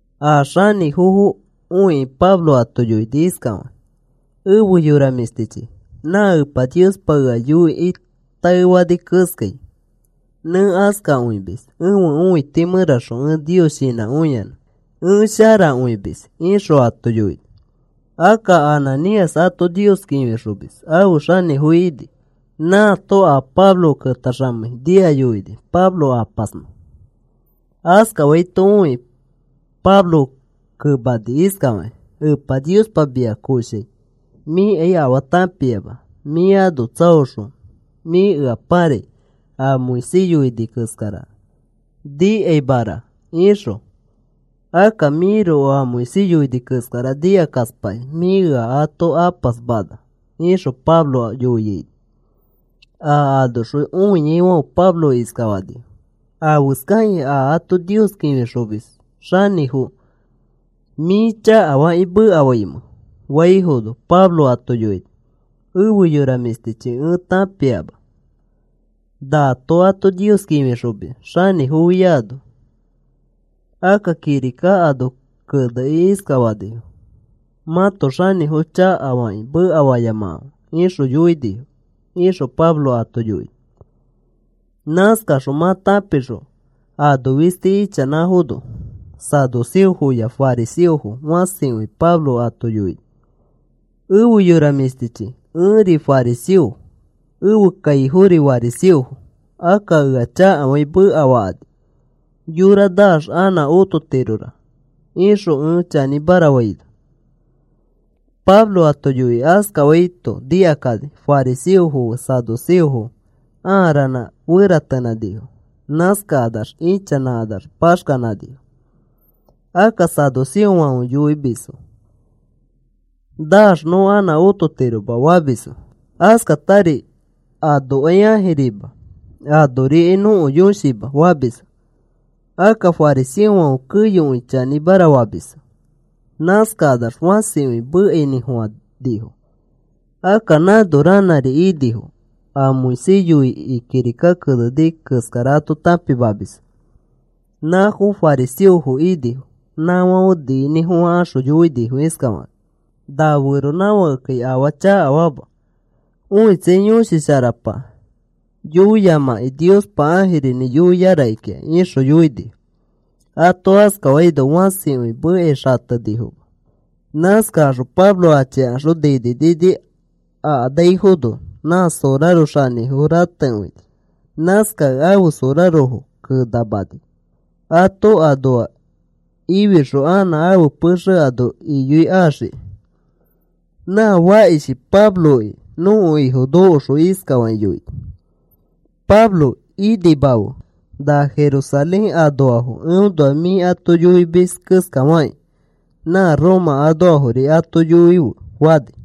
A xanĩfofo õikĩ Pablo ato yoini iskafakĩ: “Efe yora mĩshtichi, nã Epa Niospa ea yoikĩ taefani keskai, nẽ askakõimis. Ẽfe õiti mẽraxõ ẽ Nios shinãkõiyanã ẽ sharakõimis,” ixõ ato yoini. Akka Ananías ato Nios kĩfixomis ãfe xanĩfo ini. Nãato a Pablo ketaxamei nia yoini Pablo apasnõ. Askafaito õikĩ Pablo kemani iskafakĩ: “Epa Niospa mia koshai mĩkai afaa tãpiama. Mĩ ano tsaoxõ mĩ ea pãrai a Moisés yoini keskara nikaimara ixõ. Akka mĩroko a Moisés yoini keskara nikakaspakĩ, mĩ ea ato apasmana,” ixõ Pablo yoiaino, a anoxõ õiaifãfe Pablo iskafanifo: “¿Afeskakĩ a ato Nios kĩfixomis xanĩfo mĩ chakafakĩ mekafaimẽ?” faifono, Pablo ato yoini: “Efe yora mĩshtichi, ẽ tãpiama nato ato Nios kĩfixomis xanĩfofiano. Akka kirika ano kenekĩ iskafanifo: ‘Mãto xanĩfo chakafakĩ mekafayamakãfe,’ ixõ yoinifo,” ixõ Pablo ato yoini. Nãskaxõ mã tãpixõ ano fisti ichanãfono saduceofoya fariseofo fãsikõi Pablo ato yoini: “Efe yora mĩshtichi, ẽri fariseo, ẽfe kaifofori fariseofo. Akka ea chakafakĩ mekafakani, yora naax anã ototirora ixõ ẽ chanĩmara faino.” Pablo ato yoikĩ askafaito nikakani, fariseofo fe saduceofo ãa ranã feratenãnifo. Nãskakanax ichanãkanax paxkanãnifo. Akka saduceofãfe yoimisfo: “Naax nõ anã ototiroma,” famisfo. Askatari anokai ãjirima anorikai nõko yõshima famisfo. Akka fariseofãfe keyokõi chanĩmara famisfo. Nãskakanax fãsikõi mekainĩfofãnifo, akka nãno ranãri inifo a Moisés yoikĩ kirika keneni keskara ato tãpimamisfo. Nãfo fariseofo inifo, nãfãfe niinĩfofãkaxõ yoinifo iskafakakĩ: “Na feronãfakekai afaa chakafama. Õitsai, yõshi sharapa yoiyamãki Niospa ãjirinĩ yoia rakikĩa,” ixõ yoinifo. Ato askafaino fãsikõi mekai xatenifoma. Nãskakaxõ Pablo achikaxõ nini nini akanaifono nã soraro xanĩfo ratekõini. Nãskakẽ ãfe sorarofo kenamani, ato anoa ifixõ anã ãfe pexe ano iyoikaxiki. Nã fakishi Pabloki nõko Ifo nokoxõ iskafakĩ yoini: “Pablo, inimafe. Na Jerusalén anoafo eõnoa mĩ ato yoimis keskafakĩ na Roma anoafori ato yoife,” fani.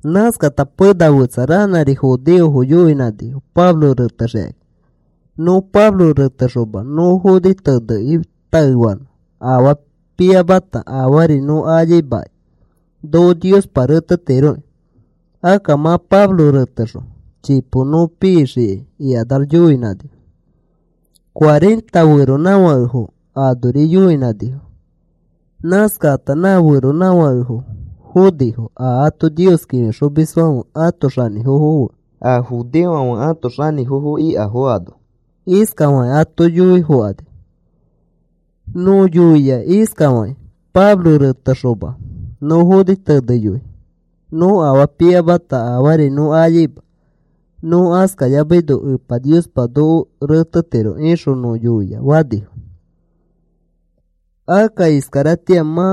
Nãskata pena fetsa ranãri judeofo yoinãnifo Pablo retexikakĩ. “Nõ Pablo retexoma nõ foni tenekĩ taefanõ, afaa piamata afaari nõ ayaimakai, noko Niospa retetiroki. Akka mã Pablo retexõ chipo nõ pixikai,” ikanax yoinãnifo. Cuarenta feronãfakefo anori yoinãnifo. Nãskakata nã feronãfakefo fonifo a ato Nios kĩfixomisfãfe ãto xanĩfofo fe a judeofãfe ãto xanĩfofo ikafo ano. Iskafakĩ ato yoifokani: “Nõ yoia iskafakĩ: ‘Pablo reteyoxoma, nõ foni teneyoi nõ afaa piyamata afaari nõ ayaima. Nõ askayamaino Epa Niospa noko retetiro,’ ixõ nõ yoia,” fanifo. “Akka iskaratĩa mã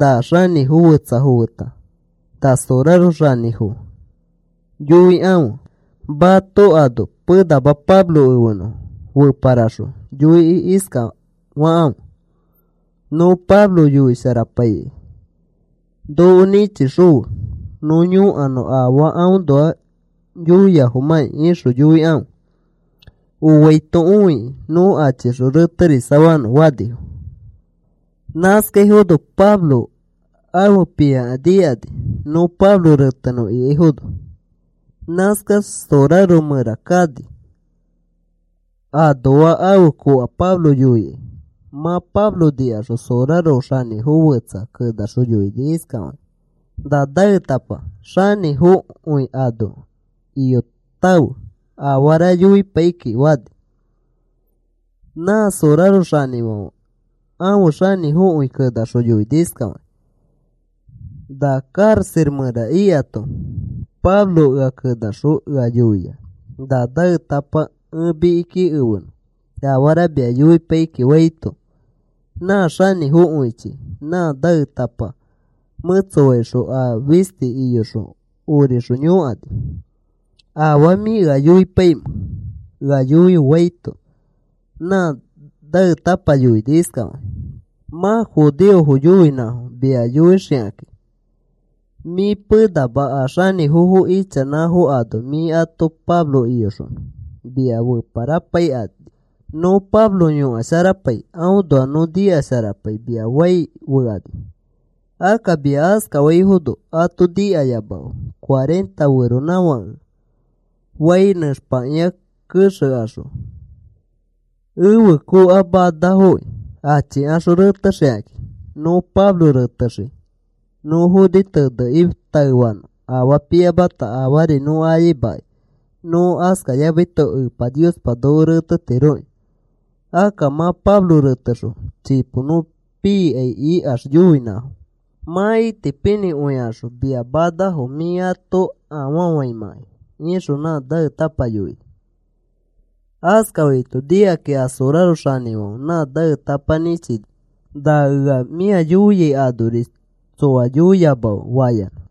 na xanĩfo fetsafo feta, na soraro xanĩfo yoikãfe mato ano penama Pablo efenõ. Feparaxõ yoikĩ iskafakãfe: ‘Nõ Pablo yõkasharapaikai noko nĩchixõfe nõ yõkanõ afaa aõnoa yoiafomãkĩ,’ ixõ yoikãfe. Oaito õikĩ nõ achixõ reterisafanõ,” fanifo. Nãskaifono Pablo ãfe pĩaka nikani nõ Pablo retenõ ikaifono. Nãskax sorarofo mẽra kani anoa ãfe koka Pablo yoikai. Mã Pablo nikaxõ, soraro xanĩfo fetsa kenaxõ yoini iskafakĩ: “Na naetapa xanĩfokõi ano iyotãfe, afara yoipai kiki,” fani. Nã soraro xanĩfãfe ãfe xanĩfokõi kenaxõ yoini iskafakĩ: “Na karaxa mẽra ikato Pablo ea kenaxõ ea yoia na naetapa ẽ mikiki efenõ afara mia yoipai kiki,” faito, nã xanĩfokõichi nã naetapa mẽtsofaixõ a fisti iyoxõ orixõ yõkani: “¿Afaa mĩ ea yoipaimẽ? Ea yoife,” faito, nã naetãpa yoini iskafakĩ: “Mã judeofo yoinãfo, mia yoixikakĩ mĩ penama a xanĩfofo ichanãfo ano mĩ ato Pablo iyoxonõ. Mia feparapaikani nõ Pablo yõkasharapai aõnoa nõ nikasharapai mia fai fekani. Akka mia askafaifono ato nikayamafe. Cuarenta feronãfakefo fai nẽxpakĩa kexekaxõ ẽfe koka manafoki achikaxõ retexikakĩ. Nõ Pablo retexii nõ foni tenekĩ taefanõ afaa piyamata afaari nõ ayaimakai. Nõ askayamaito Epa Niospa noko retetiroki. Akka mã Pablo retexõ chipo nõ pikai ikax yoinãfo, mã itipinĩkõikaxõ mia manafo mĩ ato afafaimãkai,” ixõ nã naetãpa yoini. Askafaito nikakĩ a soraro xanĩfãfe nã naetapa nĩchini, “Na ea mĩa yoiai anori tsoa yoiyamafe,” fayanã.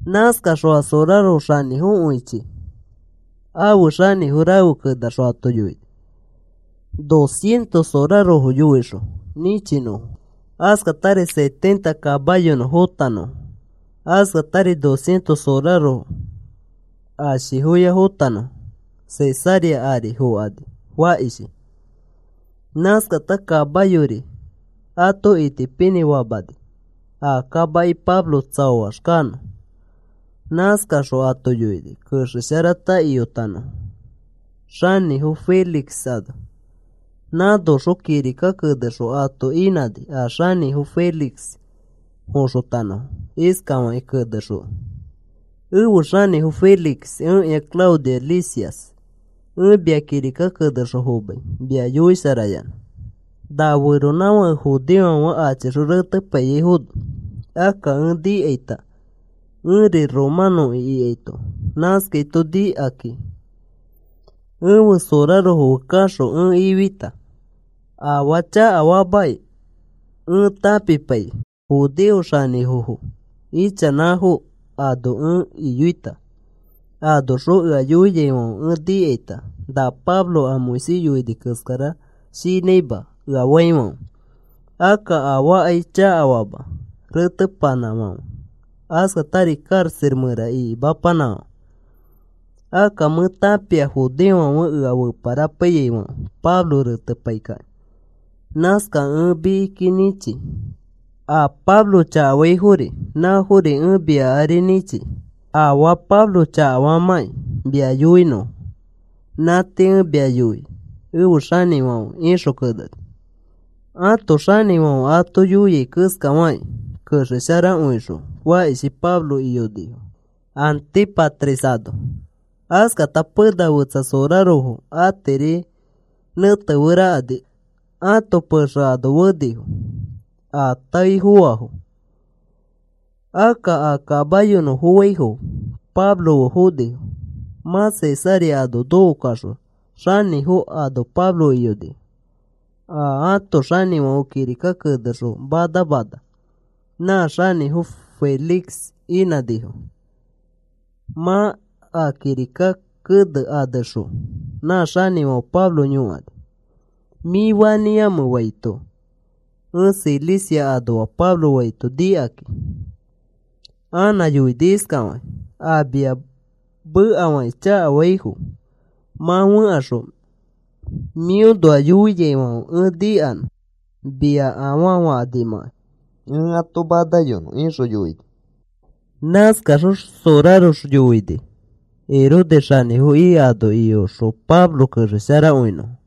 Nãskaxõ a soraro xanĩfokõichi afe xanĩfo rafe kenaxõ ato yoini dos cientos sorarofo yoixõ nĩchinõfo, askatari setenta kamayonõ fotanõfo, askatari dos cientos sorarofo ashifoya fotanõfo Cesarea ari fõkani fakishi. Nãskata kamayori ato itipinĩfamani a kamaki Pablo tsaoax kanõ. Nãskaxõ ato yoini kexesharata iyotanõfo xanĩfo Félix ano. Nãskaxõ kirika kenexõ ato inãni a xanĩfo Félix foxotanõfo iskafakĩ kenexõ: Efe xanĩfo Félix, ẽkĩa Claudio Lisias, ẽ mia kirika kenexõ fomai mia yoisharayanã. Na feronãfake judeofãfe achixõ retepaiyaifono, akka ẽ nikaita ẽri romanõki ikaito, nãskaito nikakĩ ẽfe sorarofo fe kaxõ ẽ ifita. Afaa chakafaamakĩ ẽ tãpipaikĩ, judeo xanĩfofo ichanãfo ano ẽ iyoita. Anoxõ ea yoiaifãfe ẽ nikaita, na Pablo a Moisés yoini keskara shinãima ea faifãfe. Akka afaakai chakafama retepanãfãfe, askatari karaxa mẽra ikimapanãfãfe. Akka mẽ tãpia judeofãfe ea feparapaiyaifãfe Pablo retepai kakĩ. Nãskakẽ ẽ mikiki nĩchi. A Pablo chakafaifori nãfori ẽ mia ari nĩchi, afaa Pablo chakafamãkĩ mia yoinõfo. Nã tii ẽ mia yoi efe xanĩfãfe, ixõ keneni. Ãto xanĩfãfe ato yoia keskafakĩ kexesharakõixõ, fakishi Pablo iyonifo Antípatris ano. Askata pena fetsa sorarofo atiri nẽteferakani ãto pexe ano fenifo a tãe foaifo. Akka a kamayonõ foaifo Pablo fe fonifo. Mã Cesarea ano nokokaxõ xanĩfo ano Pablo iyonifo, a ãto xanĩfãfe kirika kenexõ manamana, nã xanĩfo Félix inãnifo. Mã a kirika kene anexõ, nã xanĩfãfe Pablo yõkani: “¿Mĩ fanĩamẽ?” faito, “Ẽ Cilicia anoa,” Pablo faito nikakĩ, anã yoini iskafakĩ: “A mia mekafakĩ chakafaifo mã fẽkaxõ mĩõnoa yoiaifãfe ẽ nikanõ mia afaa fakanimãkai ẽ ato manayonõ,” ixõ yoini. Nãskaxõ sorarofo yoini Herodes xanĩfo ika ano iyoxõ Pablo kexesharakõinõfo.